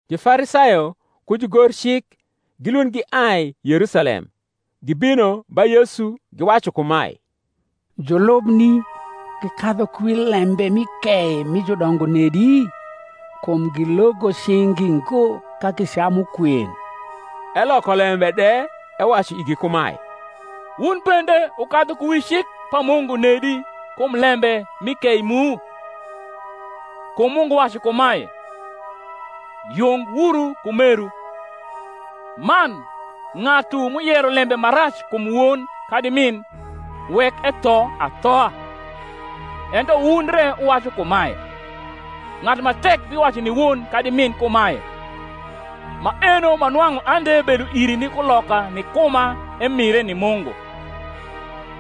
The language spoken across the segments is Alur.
Jufarisayo ku jugorcik gilund giai Yerusalem, gibino ba Yesu, giwacu kumae, Julubni gikadhu ku wi lembe mi kei mi judongo nedi? kum gilogo cing’gi ngo ka gicamu kwen. Eloko lembe de ewacu igi kumae, Wun bende wukadhu ku wi cik pa Mungu nedi kum lembe mi kei mu? Kum Mungu wacu kumae, Yung wuru ku meru: man, ng’atu m’uyero lembe ma rac kum won kadi min, wek etho athoa. Ento wun re wuwacu kumae, Ng’atu ma tek biwacu ni won kadi min kumae, Maeno ma nwang’u ande bedo iri ni kuloka ni kuma emire ni Mungu;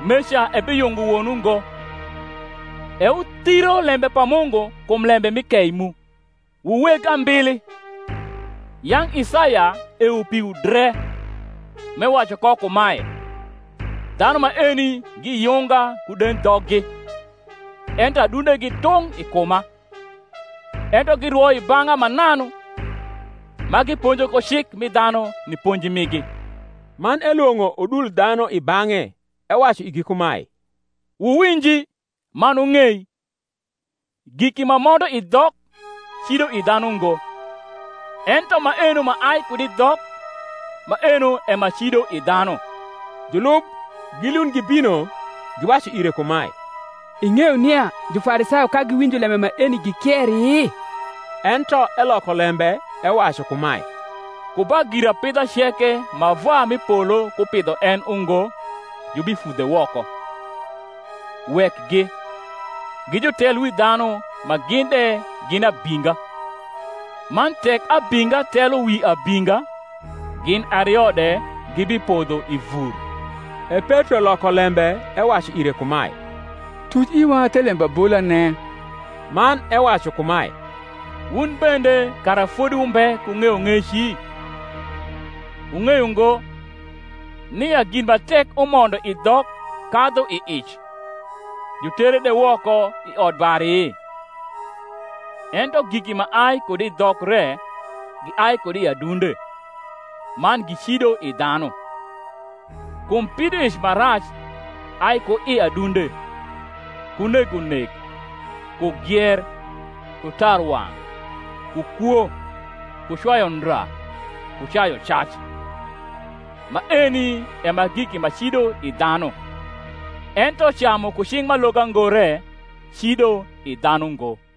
meca ebiyungo won ungo. E wuthiro lembe pa Mungu kum lembe mi kei mu. Wu weg ambili, yang’ Isaya ewo piwu dre, m’ewacu ko kumae, Dhanu maeni giyunga ku dendhoggi; Ento adundegi tung’ i kuma. Ento girwo i bang’a mananu, Ma giponjo ko cik mi dhanu ni ponji migi. Man elwong’o udul dhanu i bang’e, ewacu igi kumae, Wuwinji, man wung’ei: giki ma mondo i dhok cido i dhanu ngo; ento maeno ma ai kud i dhok, maeno e ma cido i dhanu. Julub gilund gibino, giwacu ire kumae, Ing’eyo nia Jufarisayo ka giwinjo lembe maeni, gikieri? Ento eloko lembe ewacu kumae, Ku ba girapidha ceke ma Vwa m’i polo kupidho en ungo jubifudhe woko. Wekgi: gi jutelwidhanu ma gin de gin abinga. Man tek abinga telo wi abinga, gin ario de gibipodho i vur. E Petro loko lembe ewacu ire kumae, Tuc iwa the lembabolane. Man ewacu kumae, Wun bende kara fodi wumbe ku ng’eyong’eci? Wung’eyo ngo, nia gin ma tek umondo i dhok kadhu i ic, jutere de woko i odbari? Ento giki ma ai kud i dhok re giai kud i adunde; man gicido i dhanu. Kum pidoic ma rac ai ku i adunde, ku negonek, ku gier, ku tarwang’, ku kwo, ku cwayu ndra, ku cayucac: maeni e ma giki ma cido i dhanu; ento camu ku cing’ m’aloga ngo re cido i dhanu ngo.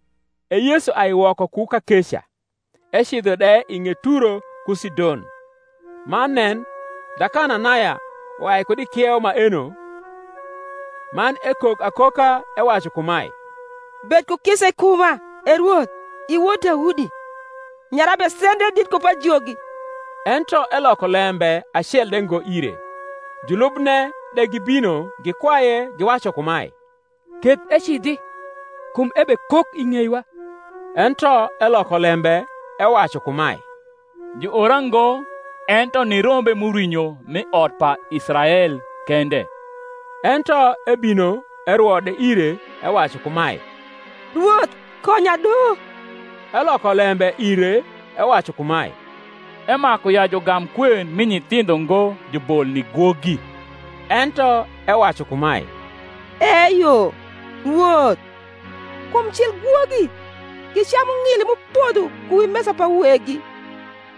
E Yesu ai woko ku kakeca, ecidho de i ng’et Turo ku Sidon. Man nen, Dhakananaya uai kud i kieu maeno, man ekok akoka, ewacu kumae, Bed ku kisa i kuma, E Rwoth, i wod Daudi: nyara besendre dit ku pajogi. Ento eloko lembe acel de ngo ire, Julubne de gibino gikwaye, giwacu kumae, Keth ecidhi; kum ebekok i ng’eiwa. Ento eloko lembe ewacu kumae, Juora ngo ento ni rombe m’urwinyo m’i ot pa Israel kende. Ento ebino erwo de ire, ewacu kumae, Rwoth, konya do. Eloko lembe ire ewacu kumae, Emaku ya jugam kwen mi nyithindho ngo jubol ni gwogi. Ento ewacu kumae, Eyo, Rwoth: kum cil gwogi gicamu ng’ili m’upodho ku wi mesa pa weggi.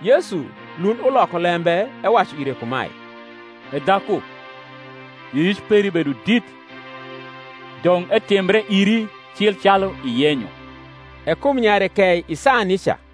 Yesu lund uloko lembe ewacu ire kumae, E dhaku, yioyic peri bedo dit: dong’ etimbre iri cil calu iyenyo. E kum nyare kei i saa nica.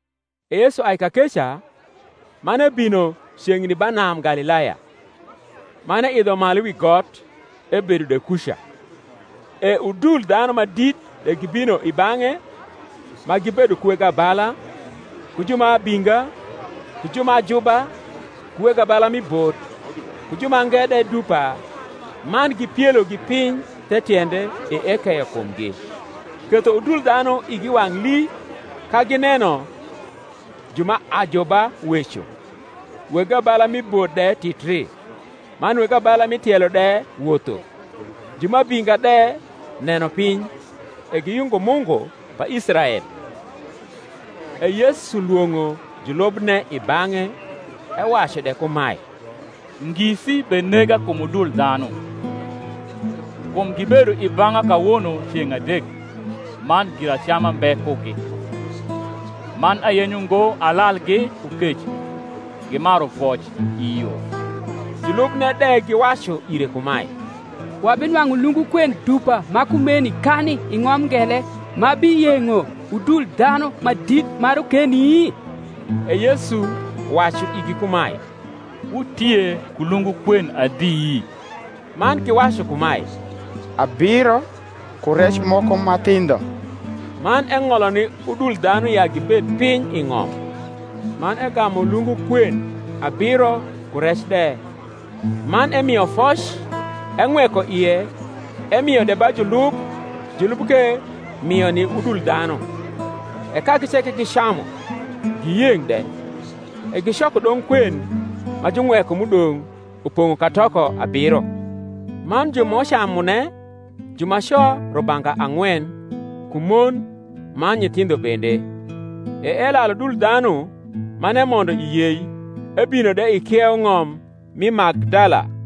E Yesu ai kakeca, man ebino ceng’ni ba nam Galilaya; man eidho malu wi got, ebedo de kuca. E udul dhanu ma dit de gibino i bang’e, ma gibedo ku weg abala, ku ju ma abinga, ku ju ma ajuba, ku weg abala mi bot, ku ju mange de dupa, man gipielogi piny the tiende; e ekeyo kumgi: ketho udul dhanu igi wang’ lii, ka gineno ju ma ajuba weco, weg abala mi bot de titri, man weg abala mi tielo de wotho, ju ma abinga de neno piny: e giyungo Mungu pa Israel. E Yesu lwong’o julubne i bang’e, ewacu de kumae, Ngisi benega kum udul dhanu, kum gibedo i bang’a kawono ceng’ adek man giracama mbe kugi: man ayenyo ngo alalgi ku kec, gimaru voc i yo. Julubne de giwacu ire kumae, Wabinwang’u lungu kwen dupa ma kumeni kani i ng’om ngele ma biyeng’o udul dhanu ma dit ma rokeni? E Yesu wacu igi kumae, Wutie ku lungu kwen adi? Man giwacu kumae, Abiro, ku rec moko ma thindho. Man eng’olo ni udul dhanu ya gibed piny i ng’om; man egamu lungu kwen abiro ku rec de; man emio foc, eng’weko ie, emio de ba julub, julub ke mio ni udul dhanu. E kagi ceke gicamu, giyeng’ de: e gicoko dong’ kwen ma jung’weko m’udong’, upong’o katoko abiro. Man ju m’ucamune jumaco rubanga ang’wen, ku mon man nyithindho bende. E elalu udul dhanu, man emondo i yei, ebino de i kieu ng’om mi Magdala.